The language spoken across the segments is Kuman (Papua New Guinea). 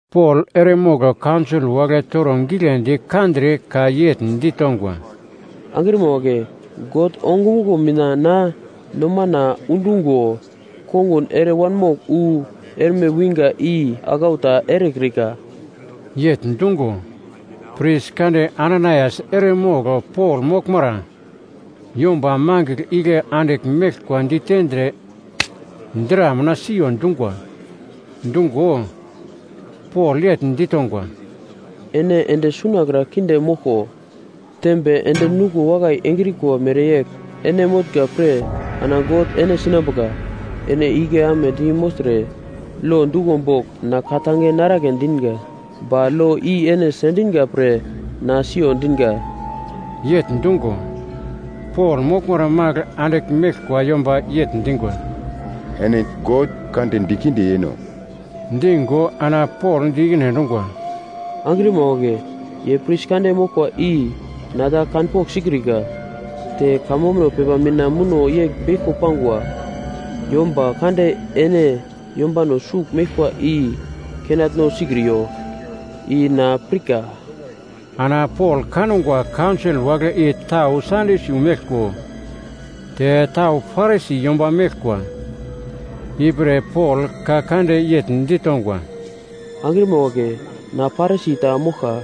Pol eremogl kaunsol wagle toro giglendi kandre ka yegl ditongwa, “Angrima wagle, God ongumuglo mina na nomana undungo kongun ere wanmogl wu erme winga i aglau ta erekrika.” Yegl dungo, pris kande Ananaias eremogl Pol moglmara yomba mangigl igle andigl meglkwa ditendre dra mina siyo dungwa. Dungo, Pol yegl ditongwa, “Ene ende sunakra kinde moglko, tembe endi-nuglo wakai engrikwa mereyegl ene motnga pre ana God ene sinambuka! Ene igle amedi mogltre lo duglo bogl na ka-tange naragle dinga, ba lo i ene sendinga pre na siyo dinga!” Yegl dungo, Pol moglmara magl andigl meglkwa yomba yegl dingwa, “Ene God prismo kande dikinde yeno?” Dingo ana Pol di ikine endungwa, “Angrima wagle, ye pris kande moglkwa i na ta kanpogl sikrika, te kamambuno pepa mina muno yegl beglko pangwa, ‘Yomba kande ene yombano sugl meglkwa i kenatno sikriyo.’ I na pirka.” Ana Pol kangwa kaunsol wagle i tau Sadyusi meglko te tau Parisi yomba meglkwa, ipre Pol ka kande yegl ditongwa, “Angrima wagle, na Parisi ta moglka,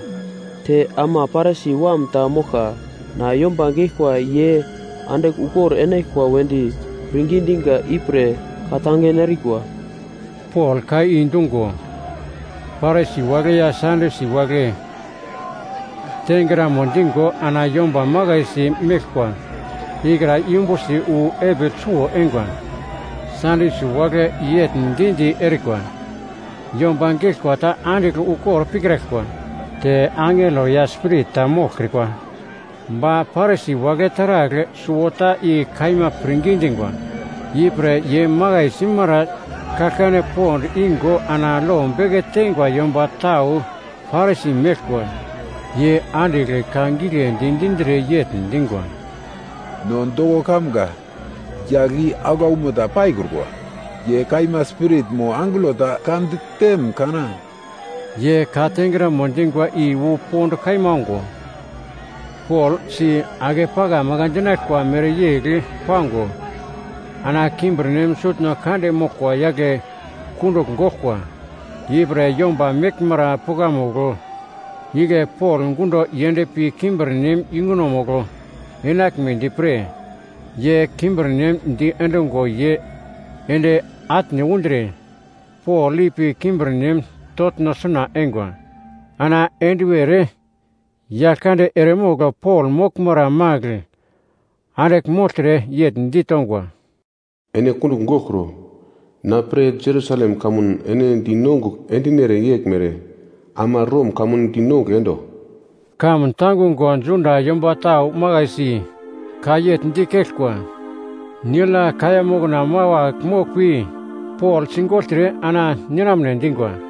te ama Parisi wam ta moglka. Na yomba geglkwa ye andigl ukor enaglkwa wedi pirngi dinga ipre ka-tange narikwa.” Pol ka i dungo, Parisi wagle ya Sadyusi wagle tengramo digo ana yomba makaisi meglkwa ikra yumbusi wu epigl suwo eingwa. Sadyusi wagle yegl di-di erikwa, “Yomba geglkwa ta andigl ukor pikraglkwa, te angelo ya spirit ta moglkrikwa.” Ba Parisi wagle taragl suwota i kaima pirngi dingwa. Ipre ye makai simara kaglkane pond ingo ana lo beke teingwa yomba tau Parisi meglkwa, ye andigl ka giglendi dindre yegl dingwa, “No doko kamga yagl i aglaumo ta paikrukwa. Ye kaima spirit mo angelo ta ka ditem kana?” Ye ka tengramo dingwa i wu pond kaima ongo, Pol si-ake pakamaka dinaglkwa mereyegl pango ana kimbirnem sutno kande moglkwa yagle kundugl goglkwa. Ipre yomba meglmara pukamugl igle Pol gundo yendpi kimbirnem yungunomugl enaglmedi pre ye kimbirnem diendungo ye ende atne undre Pol ipi kimbirnem toglno suna eingwa. Ana enduwer Yaglkande eremogl Pol moglmara magl andigl mogltre yegl ditongwa, “Ene kundugl goglkro. Na pre Jerusalem kamun ene dinongugl endinere yeglmere ama Rom kamun dinongugl endo.” Kamun tangungo Juda yomba tau makaisi ka yegl dikeglkwa, nigl ya kaiya mokna mawagl moglpi Pol sigogltre ana ninamne dingwa.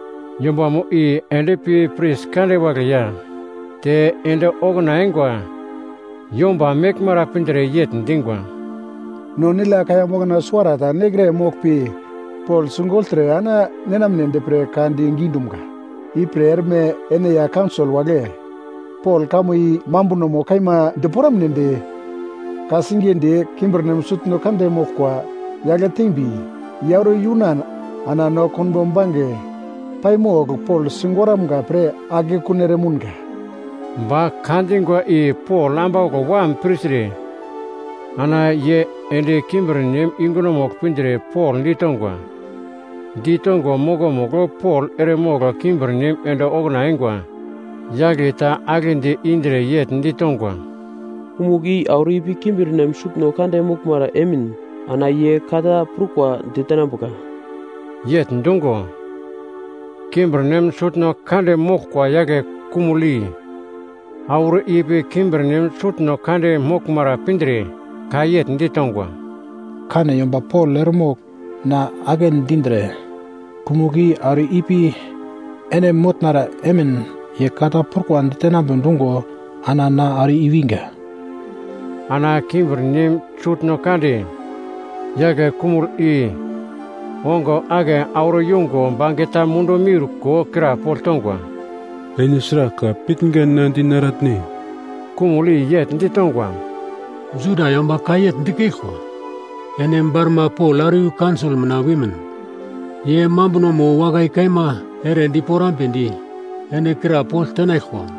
Yombamo i endpi pris kande wagle ya te ende okuna eingwa yomba meglmara pindre yegl dingwa, “No nigl ya kaiya mokna suwarata nekre moglpi Pol sigogltre ana ninamnedi pre ka digi dumga. Ipre erme ene ya kaunsol wagle Pol kamo i mambunomo kaima diporamnedi ka-singiye di kimbirnem sutno kande moglkwa yagle tembi, ye auro yunan ana no konbo bange paimogl Pol sigoramga pre akekun eremounga.” Ba ka dingwa i Pol ambauglo wam pirtre ana ye ende kimbirnem yungunomugl pindre Pol ditongwa. Ditongo mokomugl Pol eremogl kimbirnem ende okuna eingwa yagle ta aglendi indre yegl ditongwa, “Kumugl i auro ipi kimbirnem sutno kande moglmara emin ana ye ka ta prukwa ditenambuka.” Yegl dungo, kimbirnem sutno kande moglkwa yagle kumugl i auro ipi kimbirnem sutno kande moglmara pindre ka yegl ditongwa, “Kane yomba Pol eremogl na agle dindre kumugl i auro ipi ene motnara emin ye ka ta prukwa ditenambe dungo ana na auro i-winga.” Ana kimbirnem sutno kande yagle kumugl i ongo ake auro yongo bangeta mundu miurko krapogl tongwa, “Ene sragl ka pitnga na dinaratne?” Kumugl i yegl ditongwa, “Juda yomba ka yegl dikeglkwa, ene barma Pol auro iyu kaunsol mina wimin, ye mambunomo wakai kaima ere diporamnedi ene krapogl tenaglkwa.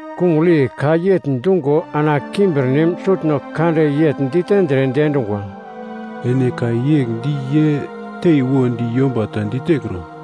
Kumugl i ka yegl dungo ana kimbirnem sutno kande yegl ditendre diendungwa, “Ene ka yegl di ye teiwodi yomba ta ditekro.”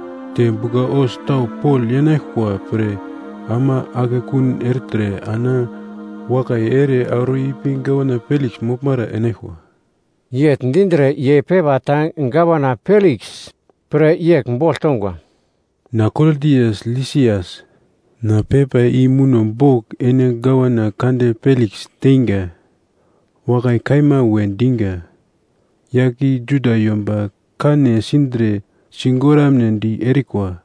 Te bugla-hos tau Pol yenaglkwa pre ama akekun ertre ana wakai ere auro ipi Gavana Peliks moglmara enaglkwa.” Yegl dindre ye pepa ta Gavana Peliks pre yegl bogl tongwa: Na Klodias Lisias, na pepa i muno bogl ene gavana kande Peliks teinga. Wakai kaima we dinga. Yagl i Juda yomba kane sindre sigoramnedi erikwa,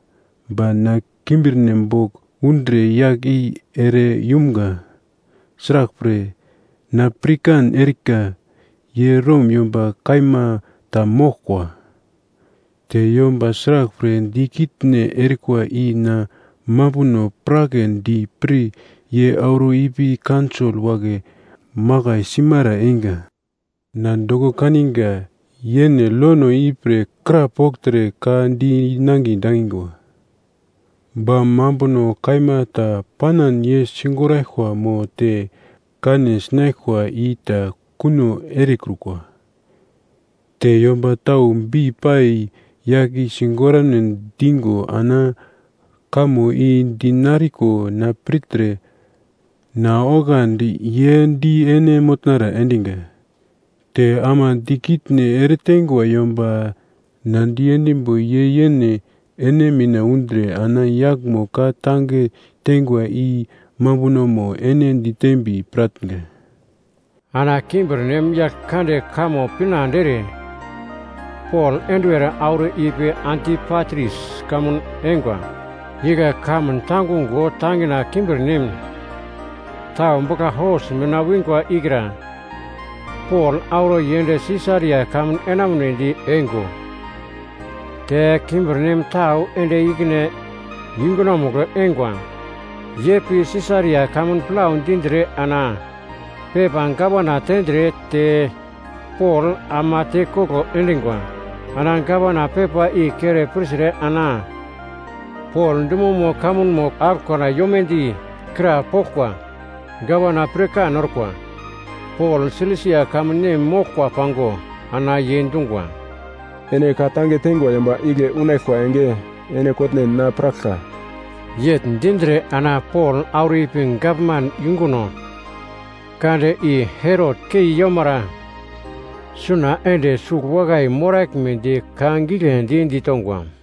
ba na kimbirnem bogl undre yagl i ere yumga. Sraglpre, na pirkan erika ye Rom yomba kaima ta moglkwa. Te yomba sraglpre dikitne erikwa i na mambuno piragledi pre ye auro ipi kaunsol wagle makai simara einga. Na doko kaninga yene lono ipre krapogltre ka di nangiye dangingwa. Ba mambuno kaima ta panan ye sigoraglkwa mo te kane sinaglkwa i ta kuno erekrukwa. Te yomba tau bei-pai yagl i sigoramne digo ana kamo i dinariko na pirtre na oglandi ye di ene motnara endinga. Te ama dikitne eretengwa yomba na diendimbo ye yene ene mina undre ana yaglmo ka-tange tengwa i mambunomo ene ditembi piratnga. Ana kimbirnem yagl kande kamo pinande ere Pol enduwer auro ipi Antipatris kamun eingwa. Igle kamun tangungo tangina kimbirnem tau bugla-hos mina wingwa ikra Pol auro yend Sisaria kamun enamunedi eingo, te kimbirnem tau ende ikine yungunomugl eingwa. Ye pi Sisaria kamun plau dindre ana pepa gavana tendre te Pol ama tekoglo endingwa. Ana gavana pepa i kere pirtre ana Pol dumomo kamunmo aglokra yomedi krapoglkwa. Gavana pirkan orkwa, Pol Silisia kamun nem moglkwa pango, ana ye dungwa, “Ene ka-tange tengwa yomba igle unaglkwa enge ene kotnen na piraglka.” Yegl dindre ana Pol auro ipi gavman yunguno kande i Herot kei yomara suna ende sugl wakai moraglmedi ka giglendi ditongwa.